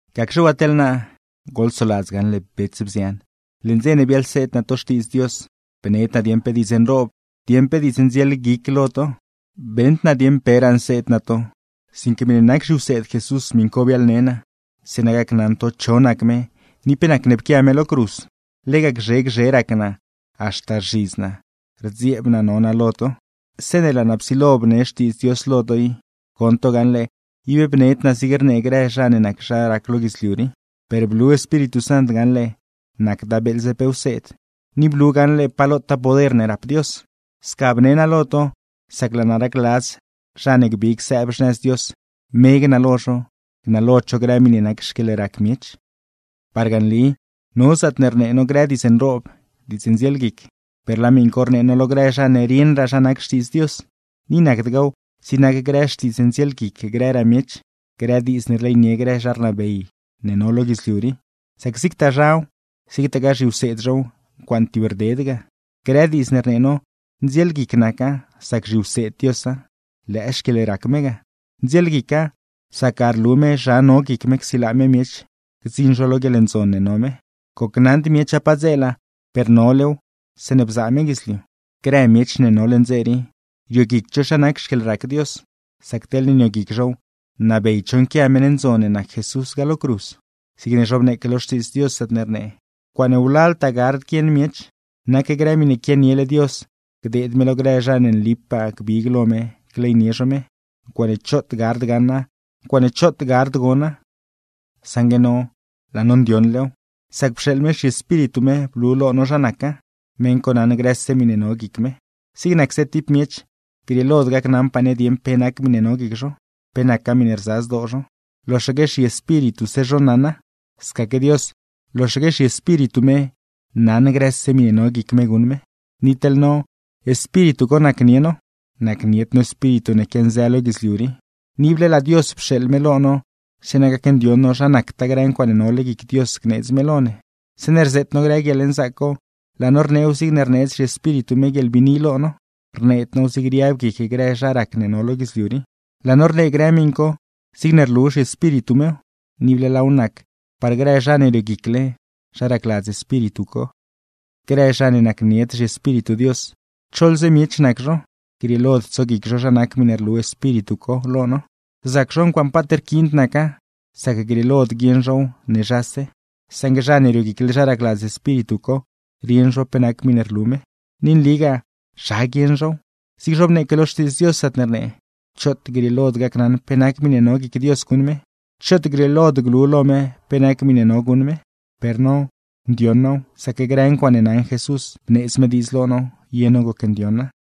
Gacxe waa teḻ naa, goḻsoladz gaṉle bets, bzian, leṉ dze ne biaḻseed naa to Xtiidz Dios, bned naa dieṉ pe diidz nroob, dieṉ pe diidz ndzielguic lo to. Beṉd naa dieṉ peraa nseed naa to, sinque miṉe nac zhiwseed Jesús miṉ co biaḻne naa, zeeṉa gacnaṉ to cho nac me ni pe nac ne pquia me lo cruz. Lega gzhe gzhe rac naa, haxta rzhidz naa, rdzieeb naa no naa lo to. Zeeṉe laa naa psilo bne Xtiidz Dios lo to i, goṉ to gaṉle ib bned naa zigne rnee grë zha ne nac zha rac lo guidzliu rii; per blu Espíritu Sant gaṉle nacda beeḻze pe wseed, ni blu gaṉle pa lotaa poder ne rap Dios. Sca bne naa lo to, sac laa naa racladz zha ne gbig sëëb xnëz Dios, me gnalo zho, gnalod zho grë miṉe nac xquieḻrac miech. Parga nli no zaatne rnee no grë diidz nroob, diidz ndzielguic, per laa miṉ co rnee no lo grë zha ne rieṉraa zha nac Xtiidz Dios, ni nacdgaaw zigne nac grë xtiidz ndzielguic grëraa miech, grë diidz ne rleynie grë zha rnabey ne no lo guidzliu rii; sac zigtaa zhaw, zigtagaa zhiwseed zhow, ncuaaṉe tibrded naca. Grë diidz ne rnee no, ndzielguic naca, sac zhiwseed Diosa, lëë xquieḻrac me ga. Ndzielguica, sac ga rlu me zha no guic me csilaa me miech gdziṉ zho lo guieḻndzon ne no me; gocnaṉd miecha padzeela, per nolew zeeṉe bzaa me guidzliu. Grë miech ne no leṉ dze rii, rioguicd zho zha nac xquieḻrac Dios; sac teḻne nioguic zhow nabeyd zho nquia meṉ ndzon ne nac Jesús ga lo cruz. Zigne zhobneeque lo Xtiidz Dios, zaatne rnee: Ncuaaṉe wlaltaa gard guieṉ miech, nac grë miṉe quianiele Dios gdeed me lo grë zha ne nlipaa gbig lo me gleynie zho me. Ncuaaṉe choot gard gaṉa, ncuaaṉe choot gard gona. Saṉgue no laa no ndioṉlew, sac pxeeḻ me zhiEspíritu me blu lo no zha naca, meṉ co naṉ grëse miṉe no guic me. Zig nacse tib miech, grieelod gacnaṉpaa ne dieṉ pe nac miṉe no guic zho, pe nacgaa miṉe rza zdoo zho, loxaque zhiespírituse zho naṉa; scaque Dios, loxaque zhiEspíritu me naṉ grëse miṉe no guic me guṉ me. Ni teḻ no, Espíritu co nacnie no (nacnied no espíritu ne quianzë lo guidzliu rii), ni ible laa Dios pxeeḻ me lo no zeeṉa gacndioṉ no zha nactaa grë ncuaaṉe nole guic Dios gneedz me lo ne. Zeeṉe rzeet no grë guieḻnzaac co, laa no rneew zigne rneedz zhiEspíritu me guieḻbiini lo no, rneed now zigne riab guic grë zha rac ne no lo guidzliu rii. Laa no rnee grë miṉ co zigne rlu zhiEspíritu mew, ni ible laaw nac par grë zha ne rioguicle zha racladz Espíritu co. Grë zha ne nacnied zhiEspíritu Dios, choḻze miech nac zho, grieelod tsoguic zho zha nac grë miṉe rlu Espíritu co lo no. Rzac zho ncuaaṉe paat rquiind naca, sac grieelod guieṉ zhow ne zhase. Saṉgue zha ne rioguicle zha racladz Espíritu co, rieṉ zho pe nac miṉe rlu me. Ni nligaa zha guieṉ zhow, zigne zhobneeque lo Xtiidz Dios, zaatne rnee: “Choot grieelod gacnaṉ pe nac miṉe no guic Dios guṉ me, choot grieelod glu lo me pe nac miṉe no guṉ me.” Per no, ndioṉ now, sac grë ncuaaṉe naṉ Jesús, bneedz me diidz lo no ye no gocndioṉa.